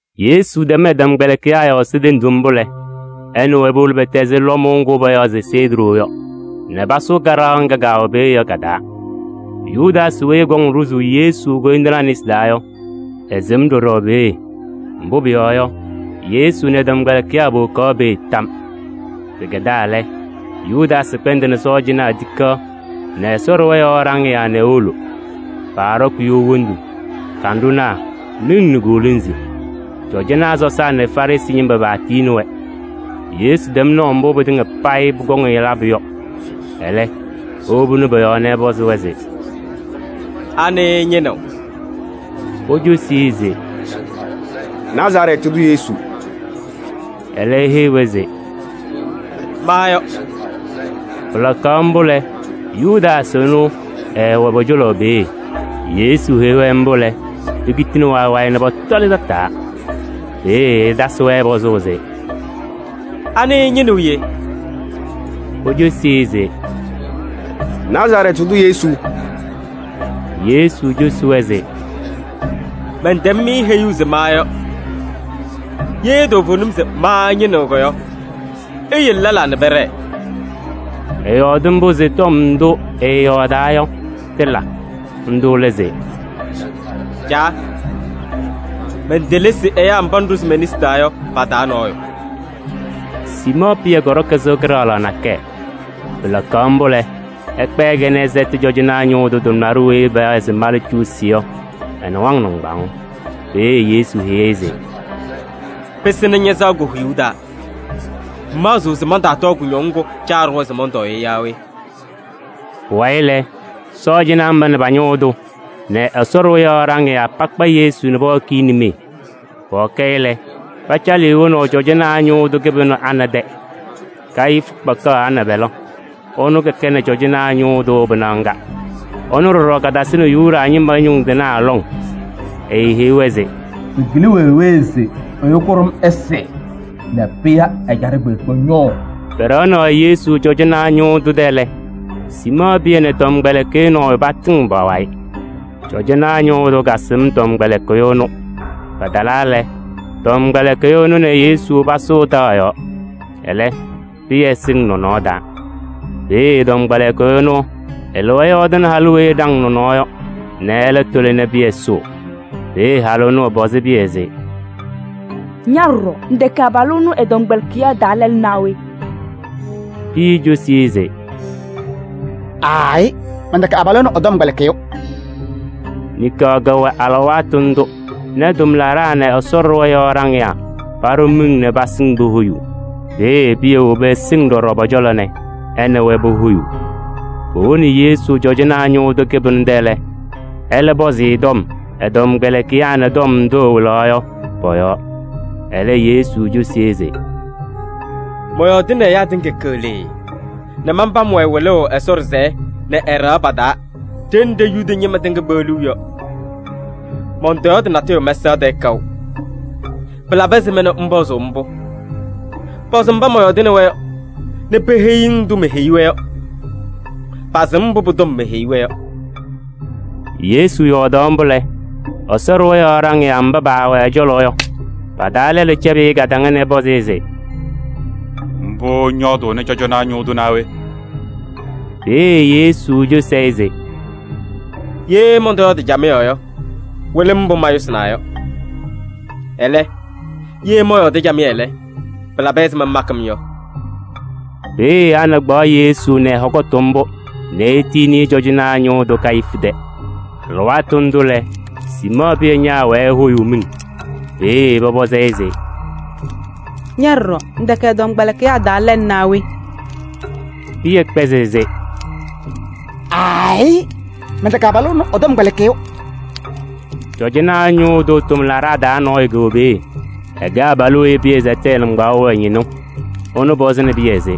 Yesu tɛm ɛ-tɔmkpɛlɩkɩyaa yɔɔ Ɛsɔ tenduu mbʋ lɛ, ɛ nɛ wɛ powolo pɛtɛzɩ lɔmʋʋ ŋgʋ payaɣ se Sedrɔɔ yɔ nɛ pasʋʋ kaɖaɣ ŋga kɛwɛ peeye yɔ ka-taa. Yudaasɩ weyi ɛkɔŋ ɖʋzʋʋ Yesu koyindinaa nesi taa yɔ, ɛsɩm ɖɔɖɔ peeye. Mbʋ pʋyɔɔ yɔ, Yesu nɛ ɛ-tɔmkpɛlɩkɩyaa powokaɣ peeye tam. Pɩkɛdaa lɛ, Yudaasɩ kpɛndɩnɩ sɔɔjanaa tikaɣ nɛ Ɛsɔ ɖɩɣa yɔɔ ɖaŋɩyaa nɛ ewolo. Paaɖɔkɩ you wondu nɛ kanɖʋnaa nɛ miŋ nɛ koolonzi. Cɔjɔnaa sɔsaa nɛ Farɩsɩ ñɩma paatiyini-wɛ. Yesu tɛm naʋ mbʋ pɩtɩŋa payɩ pʋkɔŋ-ɩ labʋ yɔ. Ɛlɛ, ewobini pɔ-yɔɔ nɛ ɛpɔzɩ-wɛ se: “Anɩ ɩñɩnɩɣ?” Pocosi-i se: “Nazarɛɛtɩ tʋ Yesu.” Ɛlɛ eheyi-wɛ se: “Ma yɔ.” Pɩlakaɣ mbʋ lɛ, Yudaasɩ ɛnʋ, ɛɛwɛ pɔ-cɔlɔ peeye. Yesu heyi-wɛ mbʋ lɛ, pekitini wayɩ wayɩ nɛ pɔtɔlɩ tataa. Peeye ɛtasɩ-wɛ pɔzʋʋ se: “Anɩ ɩñɩnɩɣ yee?” Pocosi se: “Nazarɛɛtɩ tʋ Yesu.” Yesu cosi-wɛ se: “Mɛntɛm-mɩ heyuu se ma yɔ. Ye toovenim se ma ɩñɩnɩɣ yɔ, iyele lɛlaa nɛ pɛɖɛɛ.” Ɛyɔɔdɩ mbʋ se tɔm ndʋ ɛɛyɔɔdaa yɔ, tɩla. Ndʋ lɛ se: “Caa, mentelesi ɛyaa mba ŋɖʋzɩ me-nesi taa yɔ pa-taa nɔɔyʋ.” Siimɔɔ Pɩyɛ kɔɖɔkɩ sɩɣa kɩɖaɣlaɣ nakɛyɛ. Pɩlakaɣ mbʋ lɛ, ɛkpɛɛ-kɛ nɛ ɛsɛtɩ cɔjɔnaa ñʋʋ tʋ tʋmlaɖʋ weyi payaɣ se Malcuusi yɔ ɛ-nɩwaŋ nɩŋgbaŋʋʋ. Peeye Yesu heyi-i se: “Pɩsɩnɩ ña-sɩɣa ko-huyuu taa. Ŋmaɣzɩɣ se mantaatɔɔ kʋñɔŋ ŋgʋ Caa ɖʋwa se mɔntɔɔ yɔ yaa we?” Pʋwayɩ lɛ, sɔɔjanaa mba nɛ pa-ñʋʋ tʋ nɛ Ɛsɔ ɖɩɣa yɔɔ ɖaŋɩyaa pakpa Yesu nɛ pɔhɔkɩ-ɩ nimee. Pɔhɔkɩ-ɩ lɛ, pacalɩ-ɩ wonaʋ cɔjɔnaa ñʋʋ tʋ kɩbɩnʋ Ana tɛ. Kayifu kakpaɣ Ana pɛlɛ, ɛnʋ kɛnɩ cɔjɔnaa ñʋʋ tʋ pɩnaɣ ŋga. Ɛnʋ ɖɔɖɔ katasɩnɩ Yuda ñɩma ñʋŋ tɩnaa lɔŋ. Eeheyi-wɛ se: “Pɩkɩlɩ wee wee se ɛyʋ kʋɖʋm ɛsɩ nɛ pɩya ɛjaɖɛ kpeekpe ñʋʋ.” Pɛɖɛɣaɣnɩ Yesu cɔjɔnaa ñʋʋ tʋ tɛ lɛ, Siimɔɔ Pɩyɛ nɛ tɔmkpɛlɩkɩyʋ nɔɔyʋ patɩŋɩɣ pa-wayɩ. Cɔjɔnaa ñʋʋ tʋ kasɩm tɔmkpɛlɩkɩyʋ ɛnʋ. Patalaa lɛ, tɔmkpɛlɩkɩyʋ ɛnʋ nɛ Yesu pasʋʋ taɣ yɔɔ. Ɛlɛ, Pɩyɛ sɩŋ nɔnɔɔ taa. Peeye tɔmkpɛlɩkɩyʋ ɛnʋ ɛlɩwa ɛyɔɔdɩnɩ halʋ weyi ɛɖaŋ nɔnɔɔ yɔ nɛ ɛlɛ tʋlɩ nɛ Pɩyɛ sʋʋ. Peeye halʋ ɛnʋ ɛpɔzɩ Pɩyɛ se: “Ña ɖɔɖɔ ŋtɛkɛ abalʋ ɛnʋ ɛ-tɔmkpɛlɩkɩyaa taa lɛlʋ naa we?” Pɩyɛ cosi-i se: “Aayɩ, mɛntɛkɛ abalʋ ɛnʋ ɛ-tɔmkpɛlɩkɩyʋ.” Niŋkaɣ kɛwɛ alɩwaatʋ ndʋ nɛ tʋmlaɖaa nɛ Ɛsɔ ɖɩɣa yɔɔ ɖaŋɩyaa paɖʋ miŋ nɛ pasɩŋ pohoyuu. Peeye Pɩyɛ wobi ɛsɩŋ ɖɔɖɔ pɔ-cɔlɔ nɛ ɛ nɛ wɛ pohoyuu. Powoni Yesu cɔjɔnaa ñʋʋ tʋ kɩbɩnʋ tɛ lɛ, ɛlɛ pɔzɩ-ɩ tɔm ɛ-tɔmkpɛlɩkɩyaa nɛ tɔm ndʋ ɛwɩlaɣ yɔ pɔ-yɔɔ. Ɛlɛ Yesu cosi-i se: “Mɔyɔɔdɩnɩ ɛyaa tɩŋa keɣlee nɛ manpam-wɛ wɩlʋʋ Ɛsɔ ɖɩsɛyɛ nɛ ɛ-ɖɩɣa pa-taa ɖenɖe Yuda ñɩma tɩŋa kpeɣliɣ yɔ. Mɔntɔyɔɔdɩ natʋyʋ mɛsaɣ tɛɛ kaʋ. Pɩlabɩ ɛzɩma nɛ ŋpɔzʋʋ-m mbʋ? Pɔzɩ mba mɔyɔɔdɩnɩ-wɛ yɔ nɛ peheyi-ŋ ndʋ meheyi-wɛ yɔ: pasɩm mbʋ pʋ-tɔm meheyi-wɛ yɔ.” Yesu yɔɔdaɣ mbʋ lɛ, Ɛsɔ ɖɩɣa yɔɔ ɖaŋɩyaa mba paawɛ ɛ-cɔlɔ yɔ, pa-taa lɛlʋ cɛbɩ-ɩ kadaŋa nɛ ɛpɔzɩ-ɩ se: “Mbʋ ŋyɔɔdʋʋnɩ cɔjɔnaa ñʋʋ tʋ naa we?” Peeye Yesu pɔzɩ-ɩ se: “Ye mɔntɔyɔɔdɩ camɩyɛ yɔ, wɩlɩ-m mbʋ mayʋsɩnaa yɔ. Ɛlɛ, ye mɔyɔɔdɩ camɩyɛ lɛ, pɩlabɩ ɛzɩma ŋmakɩ-m yɔ?” Peeye Ana kpaɣ Yesu nɛ ɛ-hɔkʋtʋ mbʋ nɛ etiyini-i cɔjɔnaa ñʋʋ tʋ Kayifu tɛ. Alɩwaatʋ ndʋ lɛ, Siimɔɔ Pɩyɛ ñaawɛɛ ehoyuu miŋ. Peeye pɔpɔzɩ-ɩ se: “Ña ɖɔɖɔ, ŋtɛkɛ ɛ-tɔmkpɛlɩkɩyaa taa lɛlʋ naa we?” Pɩyɛ kpɛzɩ se: “Aayɩ, mɛntɛkɛ abalʋ ɛnʋ ɛ-tɔmkpɛlɩkɩyʋ.” Cɔjɔnaa ñʋʋ tʋ tʋmlaɖaa taa nɔɔyʋ kɛwɛ peeye. Ɛkɛ abalʋ weyi Pɩyɛ sɛtɩ ɛ-nɩŋgbaaŋ yɔ ɛ-ñɩnʋ. Ɛnʋ pɔzɩnɩ Pɩyɛ se: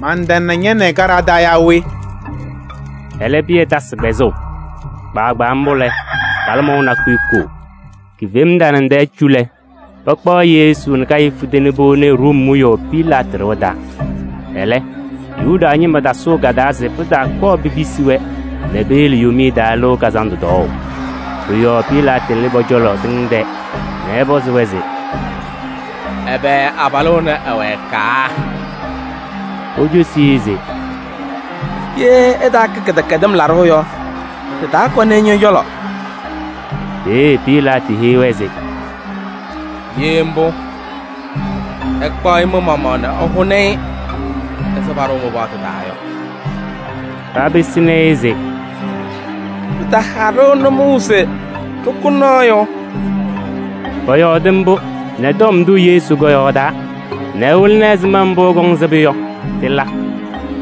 “Mantana ña nɛ ɩ kaɖaɣ taa yaa we?” Ɛlɛ Pɩyɛ tasɩ kpɛzʋʋ. Kpaagbaa mbʋ lɛ, kalɩmɔʋ nakʋyʋ koo. Kifema tanaŋ tɛɛ cu lɛ, pakpaɣ Yesu nɛ Kayifu tɛ nɛ powoni-i Room wiyaʋ Pilaatɩ ɖɩɣa taa. Ɛlɛ, Yuda ñɩma tasʋʋ ka-taa se pɩtaakɔɔ pipisi-wɛ nɛ peyele Yomiye Taa Lɩʋ Kazandʋ tɔɔʋ. Pʋ-yɔɔ Pilaatɩ lɩ pɔ-cɔlɔ tɩŋ tɛɛ nɛ ɛpɔzɩ-wɛ se: “Ɛbɛ abalʋ ɛnɛ ɛwɛkaa?” Pocosi-i se: “Ye ɛtaakɛ kɩdɛkɛdɩm laɖʋ yɔ, ɖɩtaakɔnɩ-ɩ ñɔ-cɔlɔ.” Peeye Pilaatɩ heyi-wɛ se: “Ye mbʋ, ɩkpaɣ-ɩ mɩ-maɣmaɣ nɛ ɩhʋnɩ-ɩ ɛzɩ paɖʋʋ mɩ-paɣtʋ taa yɔ.” Papɩsɩnɩ-ɩ se: “Pɩtaha-ɖʋ nʋmɔʋ se ɖɩkʋ nɔɔyʋ.” Pɔyɔɔdɩ mbʋ nɛ tɔm ndʋ Yesu kɔyɔɔdaa nɛ ɛwɩlɩnɩ ɛzɩma mbʋ ɛkɔŋ sɩbʋ yɔ, tɩla.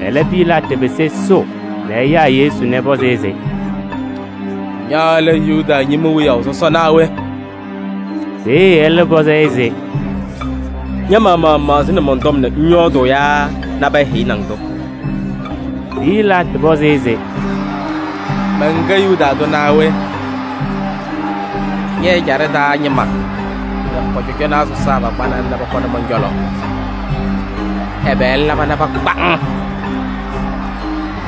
Ɛlɛ, Pilaatɩ pɩsɩ ɛsʋʋ nɛ ɛyaa Yesu nɛ ɛpɔzɩ-ɩ se: “Ña lɛ Yuda ñɩma wiyaʋ sɔsɔ naa we?” Peeye ɛlɛ pɔzɩ-ɩ se: “Ña-maɣmaɣ ŋmaɣzɩnɩ mɔn-tɔm nɛ ŋyɔɔdʋʋ yaa nabɛyɛ heyini-ŋ-tʋ?” Pilaatɩ pɔzɩ-ɩ se: “Mɛnkɛ Yuda tʋ naa we? Ñɛ-ɛjaɖɛ taa ñɩma nɛ pɔ-cɔjɔnaa sɔsaa pakpanɩ-ŋ nɛ pɔkɔnɩ mɔn-cɔlɔ! Ɛbɛ ŋlaba nɛ pakpa-ŋ?”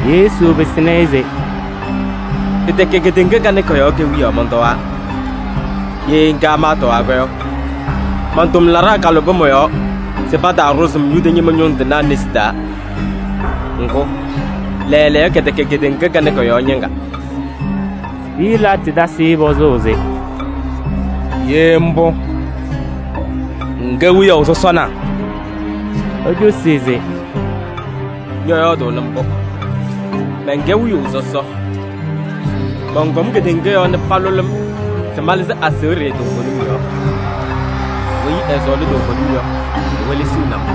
Yesu pɩsɩnɩ-ɩ se: “Pɩtɛkɛ kedeŋa kanɛ kɔ-yɔɔ kewiyaɣ mɔntɔwaa. Ye ŋga maatɔwaa yɔ, man-tʋmlaɖaa kalʋbɩ mɔ-yɔɔ se pataaɖʋzɩ-m Yuda ñɩma ñʋŋ tɩnaa nesi taa. Ŋgʋ, lɛɛlɛɛyɔ kɛtɛkɛ kedeŋa kanɛ kɔ-yɔɔ ñɩŋga.” Pilaatɩ tasɩ-ɩ pɔzʋʋ se: “Ye mbʋ, ŋkɛ wiyaʋ sɔsɔ na?” Ecosi-i se: “Ñɔyɔɔdʋʋnɩ mbʋ: mɛnkɛ wiyaʋ sɔsɔ. Mɔnkɔm kedeŋa yɔɔ nɛ palʋlɩ-m se malɩzɩ aseɣɖe toovenim yɔɔ. Weyi ɛsɔɔlɩ toovenim yɔ, ewelesiɣni-m.”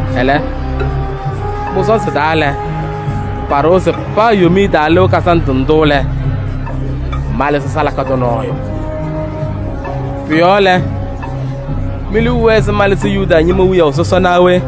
Ɛlɛ, mɩ-sɔɔnzɩ taa lɛ, paɖʋwa se paa Yomiye Taa Lɩʋ Kazandʋ ndʋ lɛ, malɩzɩ salaka tʋ nɔɔyʋ. Pʋ-yɔɔ lɛ, mi-liu wɛɛ se malɩzɩ Yuda ñɩma wiyaʋ sɔsɔ naa we?”